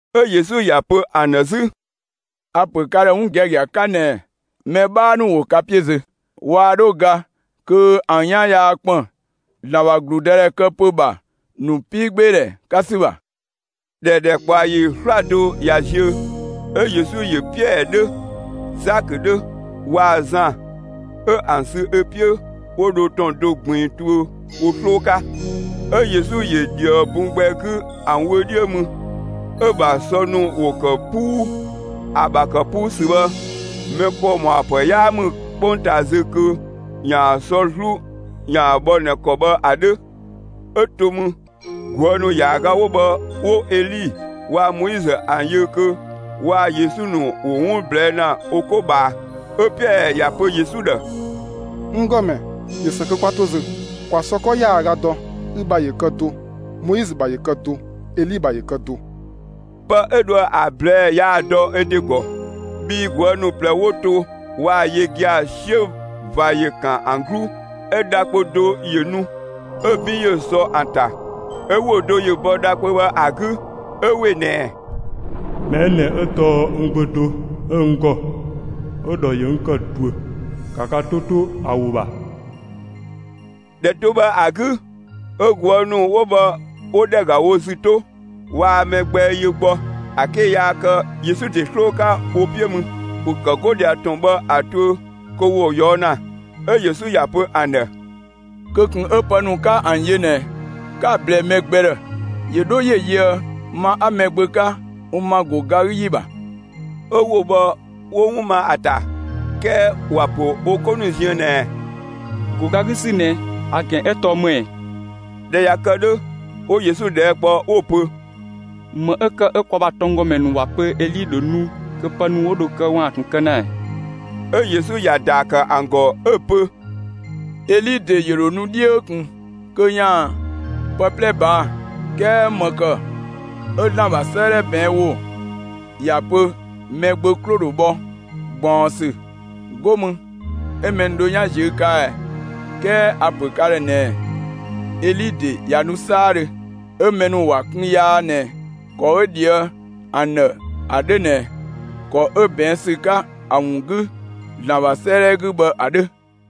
'Ö Yesu ‑ya pö ‑an ‑dhë 'zü: «A‑ ‑pö ka ‑dhë 'wun giagia 'ka ꞊nɛɛ: Mɛ 'bhaa ‑nu ‑wo ka 'piö zö, waa 'dho ga kö ‑an 'yan yaa ‑kpën ‑Zlan ‑bha ‑gludëdhɛ këdhɛpö ‑bha ‑nu 'piigbeedhɛ 'ka ‑sü ‑bha.» ꞊Dhɛ ‑dhɛkpaɔyi 'slado ꞊ya ziö, 'ö Yesu ‑yö Piɛɛ 'dhö, Zakö 'dhö, waa‑ Zan, 'ö ‑an sü ö 'piö, 'wo dho ‑tɔn do ꞊gbiin tuö wo 'sloo 'ka. 'Ö Yesu ‑yö ‑dhië bun gbɛ 'gü ‑an wö 'dhiö mü, 'ö‑ ‑bha sɔ ‑nu ‑wo ‑kë 'puu; ‑a ‑bha ‑kë 'puu ‑sü bhë, mɛ ‑kɔ ‑mɔa ‑pë 'yaa ‑mü 'kpongtaa zö kö ‑yaan sɔ 'zlu ‑yaan bhɔ ꞊nɛ ‑kɔ bhë ‑a 'dhö. 'Ö to mü, ꞊guë' ‑nu ‑yaaga 'wo bhë, 'wo Eli waa‑ Moizö ‑an yö kö waa‑ Yesu ‑nu ‑wo 'wun ꞊blɛɛ' ‑na wo 'ko ꞊bhaa. 'Ö Piɛɛ ‑ya pö Yesu ‑dhë: «N ‑Gɔmɛ, ꞊yö ‑së kö 'kwa to zö. ‑Kwa sɔ 'kɔ ‑yaaga dɔ, ü ‑bha ‑yö kë do, Moizö ‑bha ‑yö kë do, Eli ‑bha ‑yö kë do.» Pë 'ö dhoë‑ ‑a ꞊blɛɛ'‑ yaa‑ dɔ ö ‑de ‑gɔ, bhii ꞊guë' ‑nu ꞊plɛ 'wo to waa‑ yö gia‑, 'siö ꞊va ‑yö ‑kan ‑an 'gluu. 'Ö dha kpö do ‑yö nu, 'ö‑ 'bin ‑yö sɔ ‑an ‑ta. 'Ö ‑wo do ‑yö bɔ dha kpö bhë ‑a 'gü 'ö ‑we ꞊nɛɛ: «Mɛ 'ö ꞊nɛ 'ö tɔɔ n Gbö (do 'ö n ‑gɔ) 'ö‑ ‑dhɔ ‑yö n ‑kë ꞊duö. ‑Ka ka 'to 'to ‑a ‑wo ‑bha!» ‑Dhɛ do bhë ‑a 'gü, ö ꞊guë' ‑nu 'wo bhë 'wo ‑dhɛ ‑ga wo ‑zü 'to; waa mɛ gbɛ yö gbɔ, ‑a 'ke yaa kë Yesu ‑de 'sloo 'ka wo 'piö mü. ‑Wo ‑kë 'go ꞊dhia ‑tɔn bhë ‑a tuö kö ‑wo ꞊yɔɔ' ‑na, 'ö Yesu ‑ya pö ‑an ‑dhë: «Kö ꞊kun 'ö pë ‑nu 'ka ‑an yö ꞊nɛ, 'ka‑ ꞊blɛɛ mɛ gbɛ ‑dhë, ‑yö 'dho ‑yö yöë ma 'a Mɛgbö 'ka, n ‑ma ‑go ga 'gü ‑yi ‑bha.» 'Ö ‑wo bhë 'wo‑ ma ‑a ‑ta. 'Kɛɛ ‑wa ‑pö wo 'ko ‑nu ziën ꞊nɛɛ: «‑Go ga 'gü ‑sü ꞊nɛ, ‑a ‑gɛn 'ö tɔɔ ‑më ‑ɛ?» ꞊Dhɛ ꞊ya kë 'dhö, 'wo Yesu ꞊dhɛɛ' kpɔ 'wo‑ pö: «‑Më 'ö ‑kë 'ö kwa ‑bha tɔnggɔmɛ ‑nu ꞊waa‑ pö Eli ‑dho nu kö pë mɛ 'ö dho kë ‑yaan ꞊tun kë ‑na ‑ɛ?» 'Ö Yesu ‑ya ‑daa ‑kë ‑an ‑gɔ 'ö‑ pö: «Eli ‑de ‑yö ‑dho nu 'dhiö ꞊kun kö ‑yaan pë 'plɛ ꞊baa', 'kɛɛ ‑më ‑kë 'ö ‑Zlan ‑bha 'sëëdhɛ ꞊bɛɛn' ‑wo ‑ya pö Mɛgbö 'klo‑ ‑dho bhɔ ꞊gbaɔnsü, 'go mü 'ö mɛ ‑nu dhö 'yan ꞊ziö' ꞊kaa' ɛ? 'Kɛɛ a‑ ‑pö ka ‑dhë ꞊nɛɛ: Eli ‑de ꞊ya nu 'saadhö. 'ö mɛ ‑nu ‑wa kun yaa ꞊nɛ ‑kɔ 'ö ꞊dhië' ‑an ‑dhë ‑a 'dhö ꞊nɛ ‑kɔ 'ö ꞊bɛɛn ‑sü 'ka ‑a ‑wun 'gü ‑Zlan ‑bha 'sëëdhɛ 'gü bhë ‑a 'dhö.»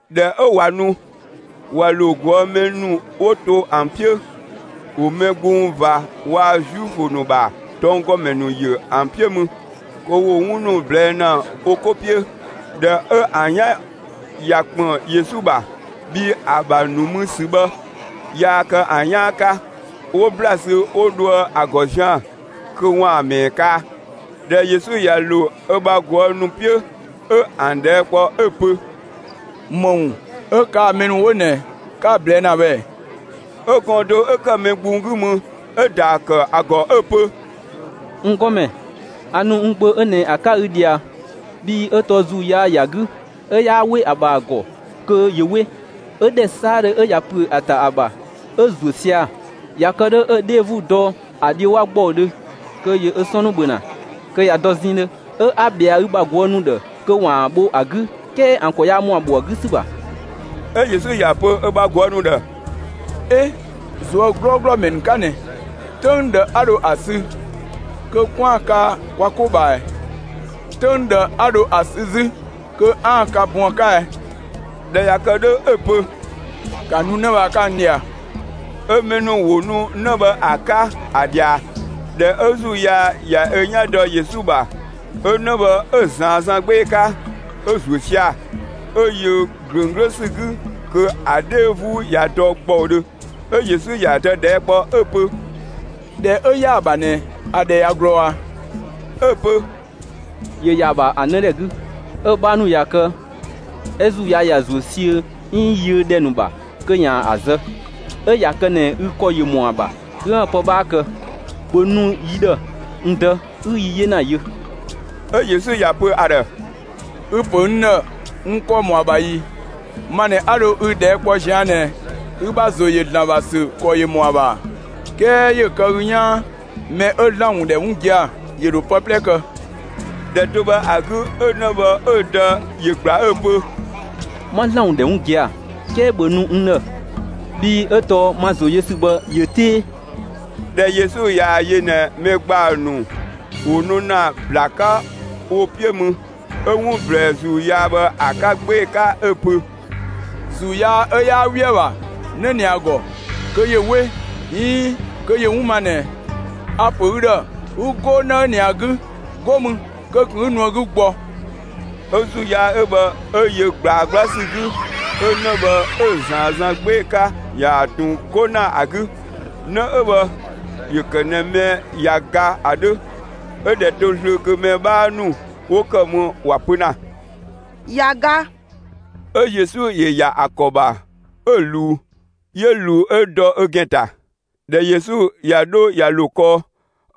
꞊Dhɛ 'ö ꞊wa nu, ꞊wa ‑lo ꞊guë' mɛ ‑nu 'wo to ‑an 'piö, ‑wo mɛ gbung ꞊va waa‑ Zuifö ‑nu ‑bha tɔnggɔmɛ ‑nu ‑yö ‑an 'piö mü, kö ‑wo 'wun ‑nu ꞊blɛɛ' ‑na wo 'ko 'piö. ꞊Dhɛ 'ö ‑an 'yan ꞊ya ‑kpën Yesu ‑bha, (bhii ‑a ‑bha nu mü ‑sü bhë yaa kë ‑an 'yaan 'ka), 'wo ‑bla sü 'wo dhoë ‑a ‑gɔ zian‑ kö ‑waan ‑mɛɛ kaa. ꞊Dhɛ Yesu ꞊ya ‑lo ö bha ꞊guë' ‑nu 'piö, 'ö ‑an ꞊dhɛɛ' kpɔ 'ö‑ pö: «‑Më ‑wun 'ö kaa‑ mɛ ‑nu 'wo ꞊nɛ, 'ka‑ ꞊blɛɛ' ‑na bhë ꞊ɛ?» 'Ö gɔɔn‑ do 'ö ‑kë mɛ gbung 'gü mü, 'ö‑ ‑daa ‑kë ‑a ‑gɔ 'ö‑ pö: «N ‑Gɔmɛ, a ‑nu n gbö 'ö ꞊nɛ ‑a 'ka ü ꞊dhia, bhii 'ö tɔɔ ‑zuu yaa ‑ya 'gü, 'ö 'yaa 'we ‑a ‑bha ‑a ‑gɔ kö ‑yö 'we. 'Ö ‑dhɛ 'saadhö 'ö ꞊ya ‑püö ‑a ‑ta ‑a ‑bha, 'ö‑ ‑zuö sia‑. ꞊Ya kë 'dhö 'ö‑ 'dhee 'vuu dɔ ‑a dhiö 'wa ‑gbɔudhö kö ‑yö ö 'sɔn ‑nu ‑bhö ‑na, kö ꞊ya dɔ zɛɛndhö. 'Ö 'a ꞊bhɛa ü bha ꞊guë' ‑nu ‑dhë kö ‑waan ‑a bho ‑a 'gü, 'kɛɛ ‑an ‑kɔ yaa ‑mɔ ‑a bho ‑a 'gü ‑sü ‑bha.» 'Ö Yesu ‑ya pö ö bha ꞊guë' ‑nu ‑dhë: «'E, ꞊zuö' 'glɔɔglɔ ‑mɛ ‑nu 'ka ꞊nɛ! 'Töng ꞊dhë 'a dho ‑a sü kö 'kwaan‑ kaa kwa 'ko ꞊bhaa ꞊ɛ? 'Töng ꞊dhë 'a dho ‑a sü 'zü kö 'aan‑ ka bun ‑a 'ka ɛ?» ꞊Dhɛ ꞊ya kë 'dhö, 'ö‑ pö: «‑Ka nu 'në bhë ‑a 'ka n ꞊dhia!» 'Ö mɛ ‑nu ‑wo nu 'në bhë ‑a 'ka, ‑a ꞊dhia. ꞊Dhɛ 'ö ‑zuu yaa ꞊ya ö 'yan dɔ Yesu ‑bha, 'ö 'në bhë 'ö‑ ꞊zaan 'zan 'gbee‑ 'ka, 'ö‑ ‑zuö sia‑ 'ö yö ꞊glöng 'glö ‑sü 'gü kö ‑a 'dhee 'vuu ꞊ya dɔ ‑gbɔudhö. 'Ö Yesu ‑ya dë ꞊dhɛɛ' kpɔ 'ö‑ pö: «꞊Dhɛ 'ö ‑ya ‑a ‑bha ꞊nɛ, ‑a ‑dhɛ ꞊ya ꞊glɔɔ ꞊a?» 'Ö‑ pö: «‑Yö ‑ya ‑a ‑bha ‑a 'nëdhɛ 'gü. 'Ö‑ 'bhaa ‑nu ꞊ya kë 'ö ‑zuu yaa ‑ya ‑zuö 'siö 'iin yiö ‑dhɛ ‑nu ‑bha kö 'yaan‑ ‑a zë. 'Ö ꞊ya kë ꞊nɛ ü ‑kɔ ‑yö ‑mɔ ‑a ‑bha 'üën‑ pë 'bhaa kë, ‑bhö nu yi ‑dhë, n dë, 'ü yi 'yena yö!» 'Ö Yesu ‑ya pö ‑a ‑dhë: «Ü‑ ‑pö n ‑dhë, n ‑kɔ ‑mɔ ‑a ‑bha ‑i? Ma ꞊nɛ 'a dho ü ꞊dhɛɛ' kpɔ ꞊zian' ꞊nɛ, ü ‑bha ‑zo ‑yö ‑Zlan ‑bha ‑sü ‑kɔ ‑yö ‑mɔ ‑a ‑bha ‑a? 'Kɛɛ ‑yö kë ü 'yaan: Mɛ 'ö ‑Zlan ‑wun ‑dhɛ 'wun gia‑, ‑yö ‑dho pë 'plɛ kë.» ‑Dhɛ do bhë ‑a 'gü 'ö 'në bhë 'ö‑ dë ‑yö ‑gbla 'ö‑ pö: «'Ma ‑Zlan ‑wun ‑dhɛ 'wun gia‑, 'kɛɛ ‑bhö nu n ‑dhë, bhii 'ö tɔɔ n ‑ma ‑zo yö ‑sü bhë ꞊yö 'tee!» ꞊Dhɛ Yesu ꞊yaa‑ yö ꞊nɛ mɛ ‑gbaa ‑nu ‑wo nu ‑na ‑bla 'ka wo 'piö mü, 'ö 'wun ꞊blɛɛ ‑zuu yaa bhë ‑a 'ka 'gbee‑ 'ka 'ö‑ pö: «‑Zuu yaa 'ö 'yaa 'we ‑a ‑bha 'në ꞊nɛ ‑a ‑gɔ kö ‑yö 'we, 'iin kö ‑yö 'wun ma ꞊nɛ, a‑ ‑pö ü ‑dhë 'ü 'go 'në 'ö ꞊nɛ ‑a 'gü! 'Go mü kö ꞊kun 'ü nu ‑a 'gü gbɔ!» 'Ö ‑zuu yaa 'ö bhë 'ö yö ꞊gblaa 'gbla ‑sü 'gü, 'ö 'në bhë 'ö‑ ꞊zaan zan 'gbee‑ 'ka ‑yaan ꞊tun 'go ‑na ‑a 'gü. 'Në 'ö bhë ‑yö ‑kë ꞊nɛ mɛ ꞊ya ga ‑a 'dhö, 'ö ꞊dhɛ 'to zlöö kö mɛ 'bhaa ‑nu 'wo ‑kë mü ‑wa pö ‑na: «꞊Ya ga.» 'Ö Yesu ‑yö ‑ya ‑a ‑kɔ ‑bha, 'ö‑ ꞊luu; 'yö ꞊luu 'ö dɔ ö ‑gɛn ‑ta. ꞊Dhɛ Yesu ꞊ya 'dho ꞊ya ‑lo kɔɔ,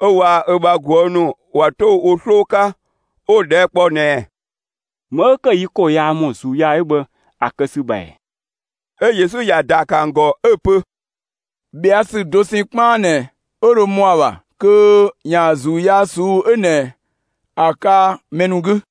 'ö waa‑ ö bha ꞊guë' ‑nu ꞊wa 'to wo 'sloo 'ka, 'wo‑ ꞊dhɛɛ' kpɔ ꞊nɛɛ: «‑Më 'ö ‑kë 'ö yi ‑kɔ yaa ‑mɔ ‑zuu yaa 'ö bhë ‑a kë ‑sü ‑bha ‑ɛ?» 'Ö Yesu ‑ya ‑daa ‑kë ‑an ‑gɔ 'ö‑ ‑pö: «꞊Bhɛa' ‑sü dosɛn 'kpaan ꞊nɛ 'ö dho ‑mɔ ‑a ‑bha kö ‑yaan ‑zuu yaa ꞊suu'‑ 'ö ꞊nɛ ‑a kaa mɛ ‑nu 'gü.»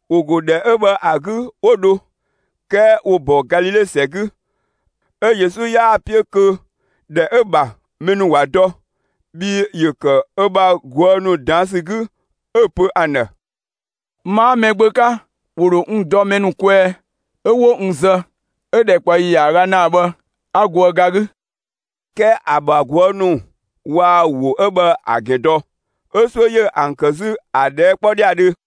‑Wo ‑go ‑dhɛ 'ö bhë ‑a 'gü 'wo dho; 'kɛɛ ‑wo ‑bɔ Galile ‑sɛ 'gü. 'Ö Yesu 'yaa‑ 'piö kö ‑dhɛ 'ö‑ ‑bha mɛ ‑nu ‑wa dɔ. Bhii ‑yö ‑kë ö bha ꞊guë' ‑nu ꞊daan' ‑sü 'gü, 'ö‑ pö ‑an ‑dhë: «Ma 'a Mɛgbö 'ka, ‑wo ‑dho n dɔ mɛ ‑nu kwɛɛ, 'ö 'wo n zë; 'ö‑ ‑dhɛkpaɔyi ‑yaaga ‑naa bhë 'a goë ga 'gü.» 'Kɛɛ ‑a ‑bha ꞊guë' ‑nu waa ‑wo 'ö bhë ‑a ‑gɛn dɔ, 'ö 'suö ‑yö ‑an ‑kë 'zü ‑a ꞊dhɛɛ' 'kpɔ ‑dhiadhö.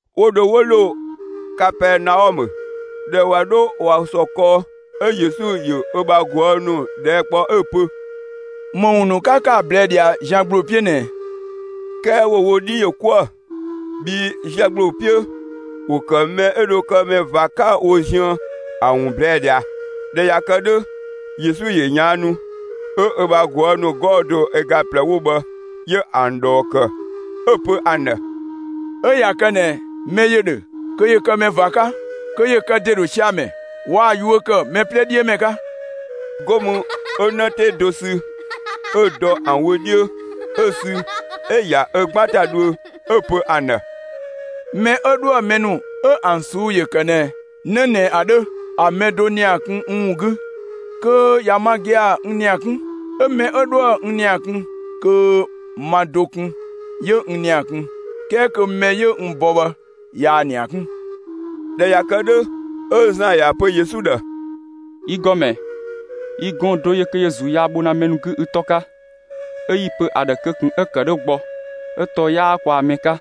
'Wo dho 'wo ‑lo Kapɛɛnaɔmë. ꞊Dhɛ ꞊wa 'dho ꞊wa ‑sɔ kɔɔ, 'ö Yesu ‑yö ö bha ꞊guë' ‑nu ꞊dhɛɛ' ‑kpɔ 'ö‑ pö: «‑Më ‑wun ‑nu 'ka ‑kë ‑a ꞊blɛɛ' ꞊dhia zian ‑gbloo 'piö ꞊nɛɛ ꞊ɛ?» 'Kɛɛ ‑wo wo 'dhi ‑yö 'kuë‑, bhii zian ‑gbloo 'piö, ‑wo ‑kë mɛ 'ö dho kë mɛ ꞊va 'ka wo ziën ‑a ‑wun ꞊blɛɛ' ꞊dhia. ꞊Dhɛ ꞊ya kë 'dhö, Yesu ‑yö ꞊yaannu, 'ö ö bha ꞊guë' ‑nu 'gɔɔ‑ do ö ga ꞊plɛ 'wo bhë, 'yö ‑an ꞊dhɔɔ ‑kë, 'ö‑ pö ‑an ‑dhë: «'Ö ꞊ya kë ꞊nɛ mɛ ‑yö ‑dhö kö ‑yö kë mɛ ꞊va 'ka, kö ‑yö kë ‑de ‑dho sia‑ ‑mɛ, waa‑ yuö ‑kë mɛ 'plɛ 'dhiö ‑mɛ 'ka.» 'Go mü 'ö 'në 'tee do sü, 'ö‑ dɔ ‑an wö 'dhiö, 'ö‑ sü 'ö‑ ‑ya ö 'gban ‑ta dhuö, 'ö‑ pö ‑an ‑dhë: «Mɛ 'ö 'dhoë‑ mɛ ‑nu 'ö ‑an ꞊suu'‑ ‑yö ‑kë ꞊nɛ 'në ꞊nɛ ‑a 'dhö, ‑a mɛ do ‑nia kun n ‑wun 'gü, kö ꞊ya ma gia‑ n ‑nia 'kun. 'Ö mɛ 'ö 'dhoë‑ n ‑nia kun, kö ma do kun 'yö n ‑nia kun, 'kɛɛ kö mɛ 'yö n bɔ bhë, ꞊yaa‑ ‑nia 'kun.» ꞊Dhɛ ꞊ya kë 'dhö, 'ö Zan ‑ya pö Yesu ‑dhë: «Yi ‑Gɔmɛ, yi gɔɔn‑ do ‑yö kö ‑yö ‑zuu yaa bho ‑na mɛ 'gü ü 'tɔ 'ka, 'ö 'yi‑ pö ‑a ‑dhë kö ꞊kun 'ö‑ ‑kë 'dhö gbɔ, 'ö tɔɔ 'yaa kwaa‑ mɛ 'ka.»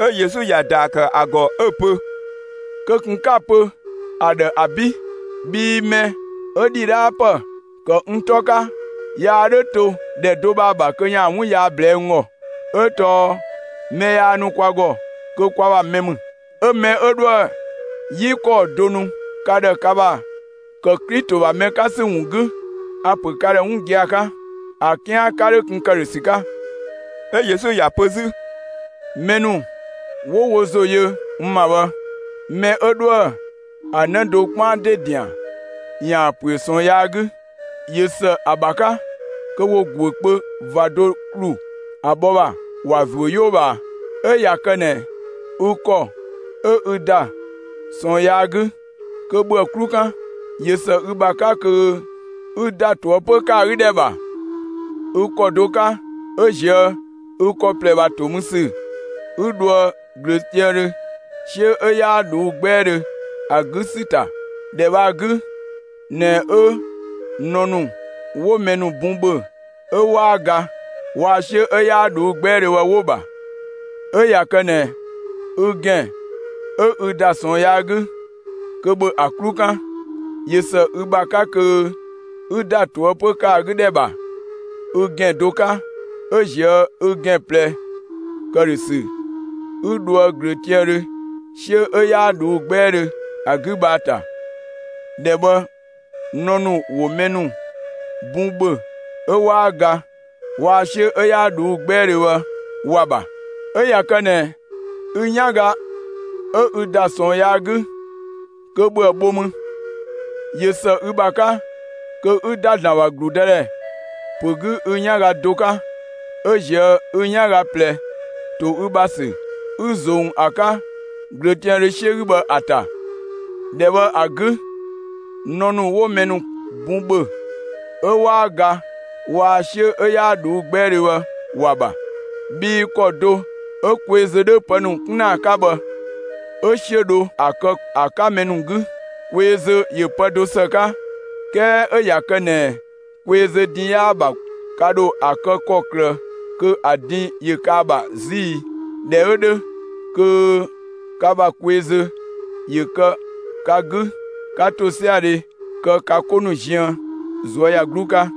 'Ö Yesu ‑ya ‑daa ‑kë ‑a ‑gɔ 'ö‑ pö: «Kö ꞊kun 'ka‑ pö ‑a ‑dhë ‑abi', bhii mɛ 'ö ‑dhidhaapë ‑kë n 'tɔ 'ka yaa 'dhö to ‑dhɛ do bhë ‑a ‑bha kö ‑yaan 'wun yaa ꞊blɛɛ'‑ n ‑gɔ. 'Ö tɔɔ mɛ yaa nu kwa ‑gɔ, kö kwa ‑mɛ ‑mü. 'Ö mɛ 'ö 'dhoë‑ 'yi ‑kɔɔ do nu ka ‑dhë ka ‑bha ‑kë Klito ‑bha mɛ ‑nu 'ka ‑sü ‑wun 'gü, a‑ ‑pö ka ‑dhë 'wun gia‑ 'ka: ‑A 'kian 'ka 'dho kun ‑këdhösü 'ka.» 'Yö Yesu ‑ya pö 'zü: «Mɛ ‑nu 'wo wo ‑zo yö n ‑ma bhë, mɛ 'ö 'dhoë‑ ‑a 'në do 'kpaan ‑de ‑dian, ‑yaan ‑püö ꞊sɔɔn yaa 'gü, ꞊yö ‑së ‑a ‑bha 'ka kö ‑wo ‑guö kpö ꞊va do ‑klu ‑a bhɔ ‑bha, ‑wa ‑zuö 'yoo ꞊bhaa. 'Ö ꞊ya kë ꞊nɛ ü ‑kɔ 'ö ü ‑da ꞊sɔɔn yaa 'gü, kö ‑bhö ‑a 'klu 'kan! ꞊Yö ‑së ü ‑bha 'ka kö ü ‑da ꞊toëpö ‑kë ‑a 'gü ‑dhɛ ‑bha ü ‑kɔ do 'ka 'ö ꞊zië' ü ‑kɔ ꞊plɛ ‑bha ‑to mü ‑sü 'ü dhoë ꞊glöötiaandhö, 'siö 'ö 'yaa ꞊dhuu' 'gbɛɛdhö ‑a 'gü ‑sü ‑ta. [‑Dhɛ bhë ‑a 'gü ꞊nɛ 'ö nɔ ‑nu 'wo mɛ bun ‑bhö 'ö 'waa ga, waa‑ 'siö 'ö 'yaa ꞊dhuu' 'gbɛɛdhö bhë 'wo‑ ‑bha.] 'Ö ꞊ya kë ꞊nɛ ü ‑gɛn 'ö ü ‑da ꞊sɔɔn yaa 'gü, kö ‑bhö ‑a 'klu 'kan! ꞊Yö ‑së ü ‑bha 'ka kö 'ü ‑da ꞊toëpö ‑kë ‑a 'gü ‑dhɛ ‑bha ü ‑gɛn do 'ka 'ö ꞊zië' ü ‑gɛn ꞊plɛ ‑këdhösü 'ü dhoë ꞊glöötiaandhö ['siö 'ö 'yaa ꞊dhuu' 'gbɛɛdhö ‑a 'gü bhë ‑a ‑ta. ‑Dhɛ bhë nɔ ‑nu ‑wo mɛ ‑nu bun ‑bhö 'ö 'waa ga, waa‑ 'siö 'ö 'yaa ꞊dhuu' 'gbɛɛdhö bhë ‑wa ‑bha.] 'Ö ꞊ya kë ꞊nɛ ü 'yanga 'ö ü ‑da ꞊sɔɔn yaa 'gü, kö ‑bhö ‑a bho mü; ꞊yö ‑së ü ‑bha 'ka kö 'ü ‑da ‑Zlan ‑bha ‑gludëdhɛ ‑pö 'gü ü 'yanga do 'ka, 'ö ꞊zië' ü 'yanga ꞊plɛ ‑to ü ‑bha ‑sü, 'ü ꞊zong ‑a 'ka ꞊glöötiaandhö 'siö 'gü bhë ‑a ‑ta. ‑Dhɛ bhë ‑a 'gü, nɔ ‑nu 'wo mɛ bun ‑bhö 'ö 'waa ga, waa‑ 'siö 'ö 'yaa ꞊dhuu' 'gbɛɛdhö bhë, ‑wa ‑bha. Bhii ‑kɔ do 'ö kweezö 'dhö pë ‑nu 'kun ‑na ‑a 'ka bhë, 'ö 'siö ‑dho ‑a kë ‑a 'ka mɛ ‑nu 'gü. Kweezö ‑yö pë do ‑së 'ka, 'kɛɛ 'ö ꞊ya kë ꞊nɛ kweezö din 'yaa‑ ‑bha, ka ‑dho ‑a kë ‑kɔklë kö ‑a din ‑yö kë ‑a ‑bha 'zü ‑i? ꞊Dhɛ 'ö 'dhö, kö ka ‑bha kweezö ‑yö kë ka 'gü, 'ka ‑tosiadhe kë ka 'ko ‑nu ziën ꞊zuöyagluu 'ka.»